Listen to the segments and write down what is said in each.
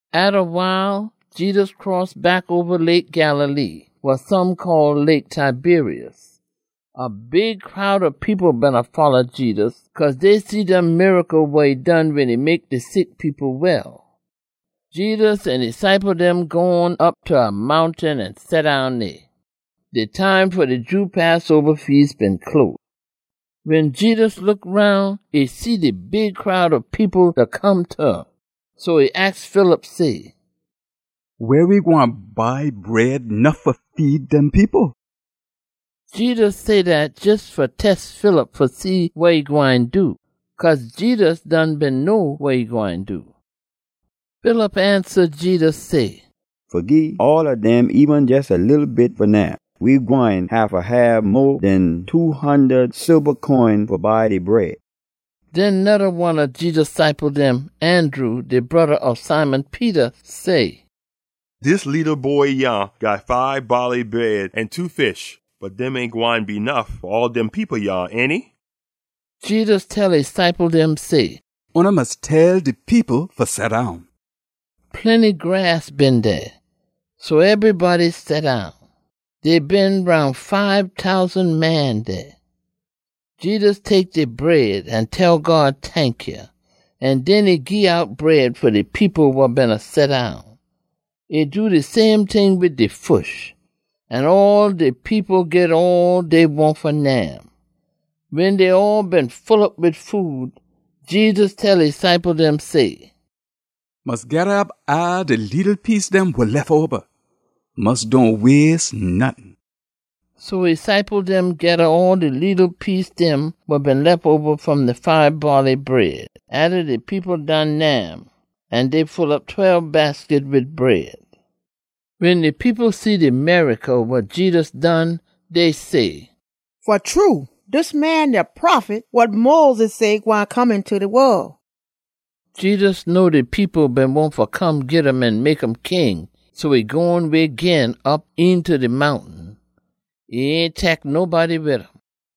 Atta wile, Jedus cross back oba Lake Galilee (wa some call Lake Tiberias). A big crowd ob people beena folla Jedus, cause dey see dem miracle wa e done wen e mek de sick people well. Jedus an e ciple dem gone op ta a mountain an seddown dey. De time fa de Jew Passoba Feas been close. Wen Jedus look roun, e see de big crowd ob people da come ta um, so e aks Philip say, “Weh we gwine buy bread nuff fa feed dem people?” Jedus say dat jes fa test Philip fa see wa e gwine do. Cause Jedus done been know wa e gwine do. Philip ansa Jedus say, “Fa gii all ob dem eben jes a leetle bit fa nyam, we gwine haffa hab mo den two hundud silba coin fa buy de bread.” Den noda one ob Jedus ciple dem, Andrew, de broda ob Simon Peter, say, “Dis leetle boy yah got fibe baaley bread an two fish. Bot dem ain gwine be nuff fa all dem people yah, ainty?” Jedus tell e ciple dem say, “Oona mus tell de people fa seddown.” Plenty grass been dey, so ebrybody seddown. Dey been roun fibe tousan man dey. Jedus tek de bread an tell God tankya, an den e gii out bread fa de people wa beena seddown. E do de same ting wid de fish. An all de people git all dey wahn fa nyam. Wen dey all been full op wid food, Jedus tell e ciple dem say, “Mus geda op all de leetle piece dem wa lef oba. Mus dohn waste nottin.” So e ciple dem geda all de leetle piece dem wa been lef oba fom de fibe baaley bread atta de people done nyam, an dey full op tweb basket wid bread. Wen de people see de miracle wa Jedus done, dey say, “Fa true, dis man de Prophet wa Moses say gwine come eenta de wol.” Jedus know de people been wahn fa come git um an mek um king, so e gone way gin, op eenta de mountain. E ain tek nobody wid um.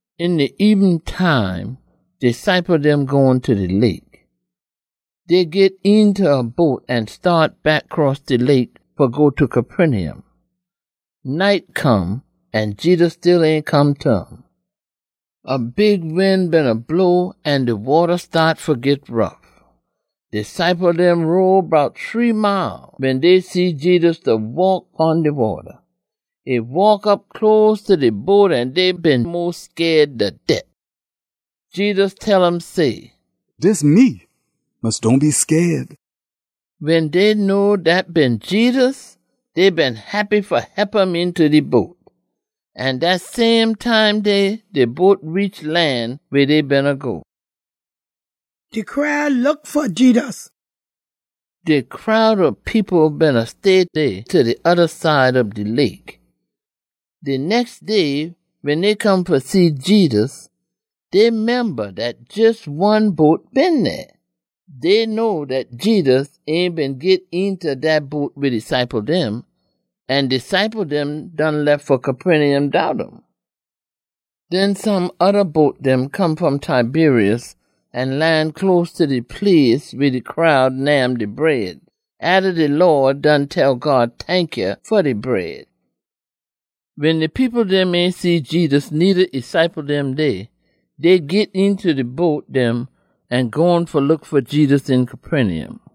Een de ebenin time de ciple dem gone ta de lake. Dey git eenta a boat an staat back cross de lake fa go ta Capernaum. Night come, an Jedus still ain come ta um. A big wind beena blow an de wata staat fa git rough. De ciple dem row bout shree mile wen dey see Jedus da waak pon de wata. E waak op close ta de boat an dey been mos scaid ta det. Jedus tell um say, “Dis me! Mus dohn be scaid.” Wen dey know dat been Jedus, dey been heppy fa hep um eenta de boat. An dat same time dey, de boat reach lan weh dey beena go. De crowd ob people beena stay dey ta de oda side ob de lake. De nex day, wen dey come fa see Jedus, dey memba dat jes one boat been dey. Dey know dat Jedus ain been git eenta dat boat wid e ciple dem, an de ciple dem done lef fa Capernaum dout um. Den some oda boat dem come fom Tiberias an lan close ta de place weh de crowd nyam de bread, atta de Lawd done tell God tankya fa de bread. Wen de people dem ain see Jedus needa e ciple dem dey, dey git eenta de boat dem an gone fa look fa Jedus een Capernaum.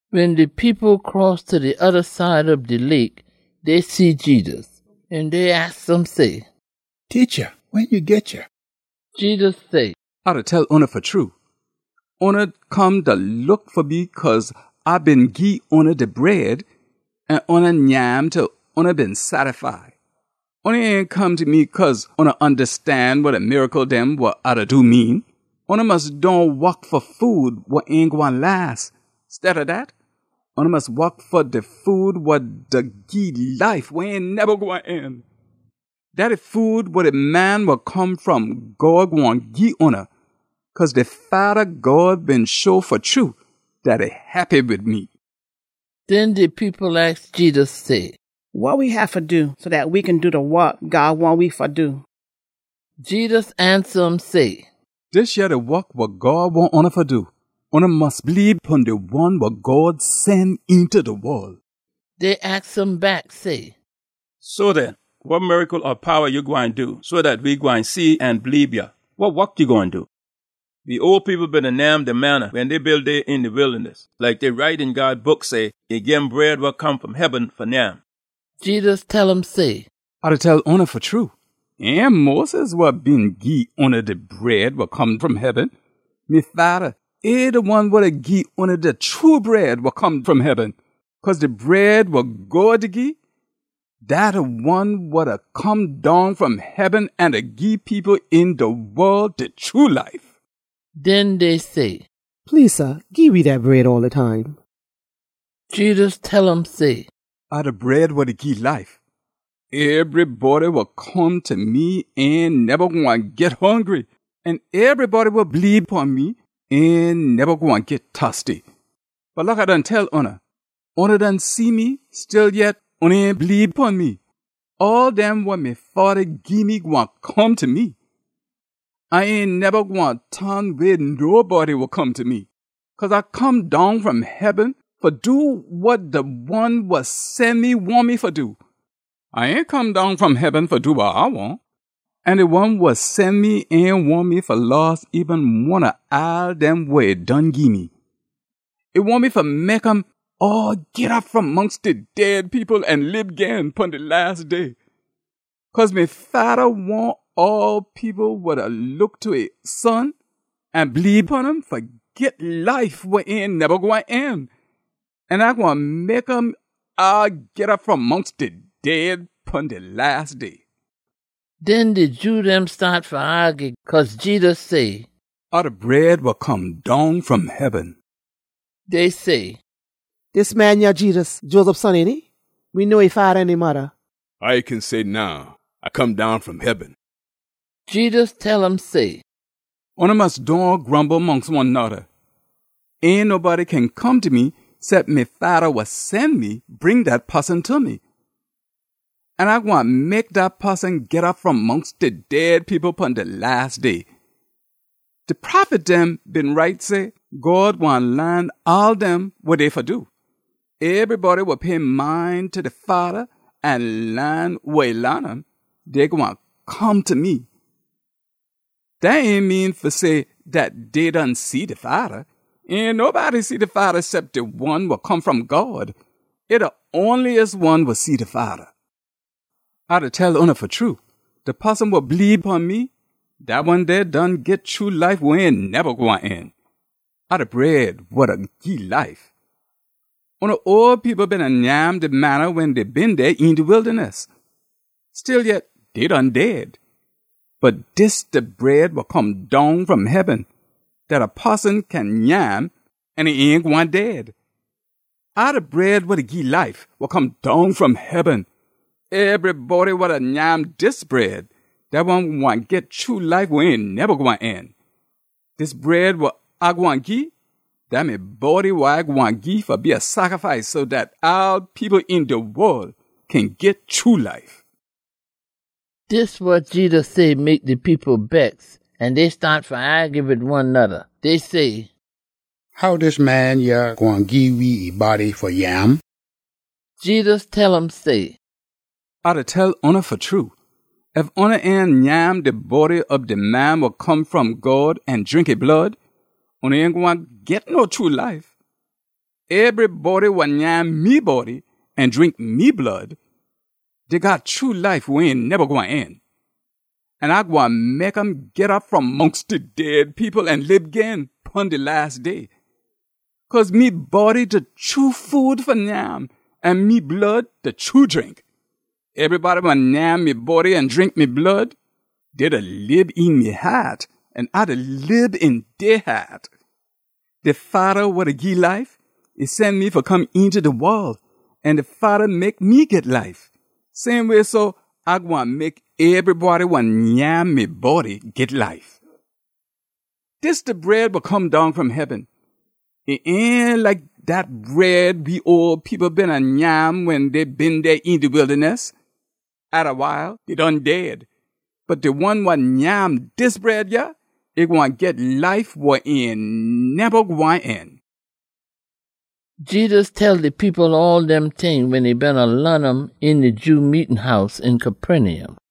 Wen de people cross ta de oda side ob de lake, dey see Jedus. An dey aks um say, “Teacha, wen ya git yah?” Jedus say, “A da tell oona fa true. Oona come da look fa me cause A been gii oona de bread, an oona nyam til oona been sattify. Oona ain come ta me cause oona ondastan wa de miracle dem wa A da do mean. Oona mus dohn wok fa food wa ain gwine las. Stead ob dat, oona mus wok fa de food wa da gii life wa ain neba gwine end. Dat de food wa de Man wa Come fom God gwine gii oona, cause de Fada God been show fa true dat e heppy wid me.” Den de people aks Jedus say, “Wa we haffa do, so dat we kin do de wok God wahn we fa do?” Jedus ansa um say, “Dis yah de wok wa God wahn oona fa do: Oona mus bleebe pon de one wa God sen eenta de wol.” Dey aks um back say, “So den wa miracle ob powa ya gwine do so dat we gwine see an bleebe ya? Wa wok ya gwine do? We ole people beena nyam de manna wen dey been dey een de wildaness. Like dey write een God Book say, ‘E gim bread wa come fom heaben fa nyam.’” Jedus tell um say, “A da tell oona fa true, ain Moses wa been gii oona de bread wa come fom heaben. Me Fada, e de one wa da gii oona de true bread wa come fom heaben. Cause de bread wa God da gii, dat de one wa da come down fom heaben an da gii people een de wol de true life.” Den dey say, “Please sah, gii we dat bread all de time.” Jedus tell um say, “A de bread wa da gii life. Ebrybody wa come ta me ain neba gwine git hongry, an ebrybody wa bleebe pon me ain neba gwine git tosty. Bot like A done tell oona, oona done see me, stillyet oona ain bleebe pon me. All dem wa me Fada gii me gwine come ta me. A ain neba gwine ton way nobody wa come ta me. Cause A come down fom heaben fa do wa de one wa sen me wahn me fa do. A ain come down fom heaben fa do wa A wahn. An de one wa sen me ain wahn me fa loss eben one ob all dem wa e done gii me. E wahn me fa mek um all git op fom mongst de dead people an lib gin, pon de las day. Cause me Fada wahn all people wa da look ta e Son an bleebe pon um fa git life wa ain neba gwine end. An A gwine mek um all git op fom mongst de dead pon de las day.” Den de Jew dem staat fa aagy ginst um, cause Jedus say, “A de bread wa come down fom heaben.” Dey say, “Dis man yah Jedus, Joseph son, ainty? We know e fada an e modda. How e kin say now, ‘A come down fom heaben?’” Jedus tell um say, “Oona mus dohn grumble mongst one noda! Ain nobody kin come ta me cep me Fada wa sen me bring dat poson ta me. An A gwine mek dat poson git op fom mongst de dead people pon de las day. De prophet dem been write say, ‘God gwine laan all dem wa dey fa do.’ Ebrybody wa pay mind ta de Fada an laan wa e laan um, dey gwine come ta me. Dat ain mean fa say dat dey done see de Fada. Ain nobody see de Fada cep de one wa come fom God. E de onliest one wa see de Fada. A da tell oona fa true, de poson wa bleebe pon me, dat one dey done git true life wa ain neba gwine end. A de bread wa da gii life. Oona ole people beena nyam de manna wen dey been dey een de wildaness. Stillyet, dey done dead. Bot dis de bread wa come down fom heaben, dat a poson kin nyam an e ain gwine dead. A de bread wa da gii life, wa come down fom heaben. Ebrybody wa da nyam dis bread, dat one gwine git true life wa ain neba gwine end. Dis bread wa A gwine gii, dat me body wa A gwine gii fa be a sacrifice so dat all people een de wol kin git true life.” Dis wa Jedus say mek de people bex, an dey staat fa aagy wid one noda. Dey say, “How dis man yah gwine gii we e body fa nyam?” Jedus tell um say, “A da tell oona fa true. Ef oona ain nyam de body ob de Man wa Come fom God an drink e blood, oona ain gwine git no true life. Ebrybody wa nyam me body an drink me blood, dey got true life wa ain neba gwine end. An A gwine mek um git op fom mongst de dead people an lib gin, pon de las day. Cause me body de true food fa nyam, an me blood de true drink. Ebrybody wa nyam me body an drink me blood, dey da lib een me haat, an A da lib een dey haat. De Fada wa da gii life, e sen me fa come eenta de wol, an de Fada mek me git life. Same way so, A gwine mek ebrybody wa nyam me body git life. Dis de bread wa come down fom heaben. E ain like dat bread we ole people beena nyam wen dey been dey een de wildaness. Atta wile, dey done dead. Bot de one wa nyam dis bread yah, e gwine git life wa ain neba gwine end.” Jedus tell de people all dem ting wen e beena laan um een de Jew meetin house een Capernaum.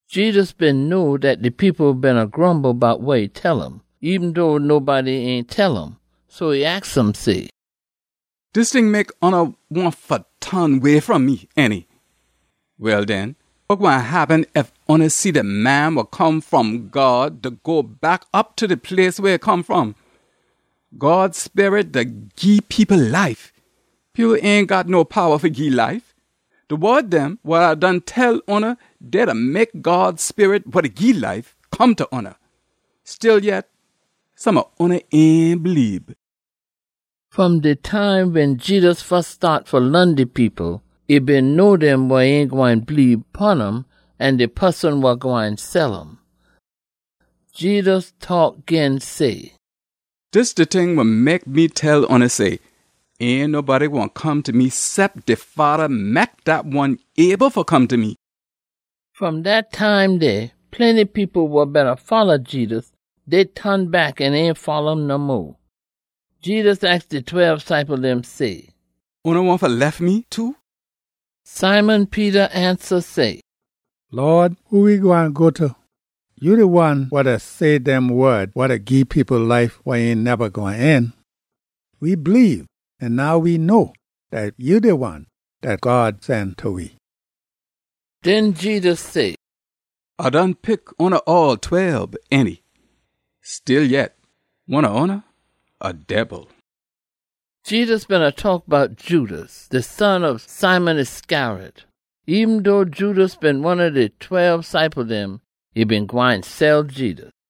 Jedus been know dat de people beena grumble bout wa e tell um, eben dough nobody ain tell um. So e aks um say, “Dis ting mek oona wahn fa ton way fom me, ainty? Well den, wa gwine happen ef oona see de Man wa Come fom God da go back op ta de place weh e come fom? God Sperit da gii people life. People ain got no powa fa gii life. De wod dem wa A done tell oona, dey da mek God Sperit, wa da gii life, come ta oona. Stillyet, some ob oona ain bleebe.” (Fom de time wen Jedus fus staat fa laan de people, e been know dem wa ain gwine bleebe pon um an de poson wa gwine sell um.) Jedus taak gin say, “Dis de ting wa mek me tell oona say, ain nobody gwine come ta me cep de Fada mek dat one able fa come ta me.” Fom dat time dey, plenty people wa beena folla Jedus, dey ton back an ain folla um no mo. Jedus aks de tweb ciple dem say, “Oona wahn fa lef me too?” Simon Peter ansa say, “Lawd, who we gwine go ta? Ya de one wa da say dem wod wa da gii people life wa ain neba gwine end. We bleebe, an now we know dat ya de one dat God sen ta we.” Den Jedus say, “A done pick oona all tweb, ainty? Stillyet, one ob oona a debil!” Jedus beena taak bout Judas, de son ob Simon Iscariot. Eben dough Judas been one ob de tweb ciple dem, e been gwine sell Jedus.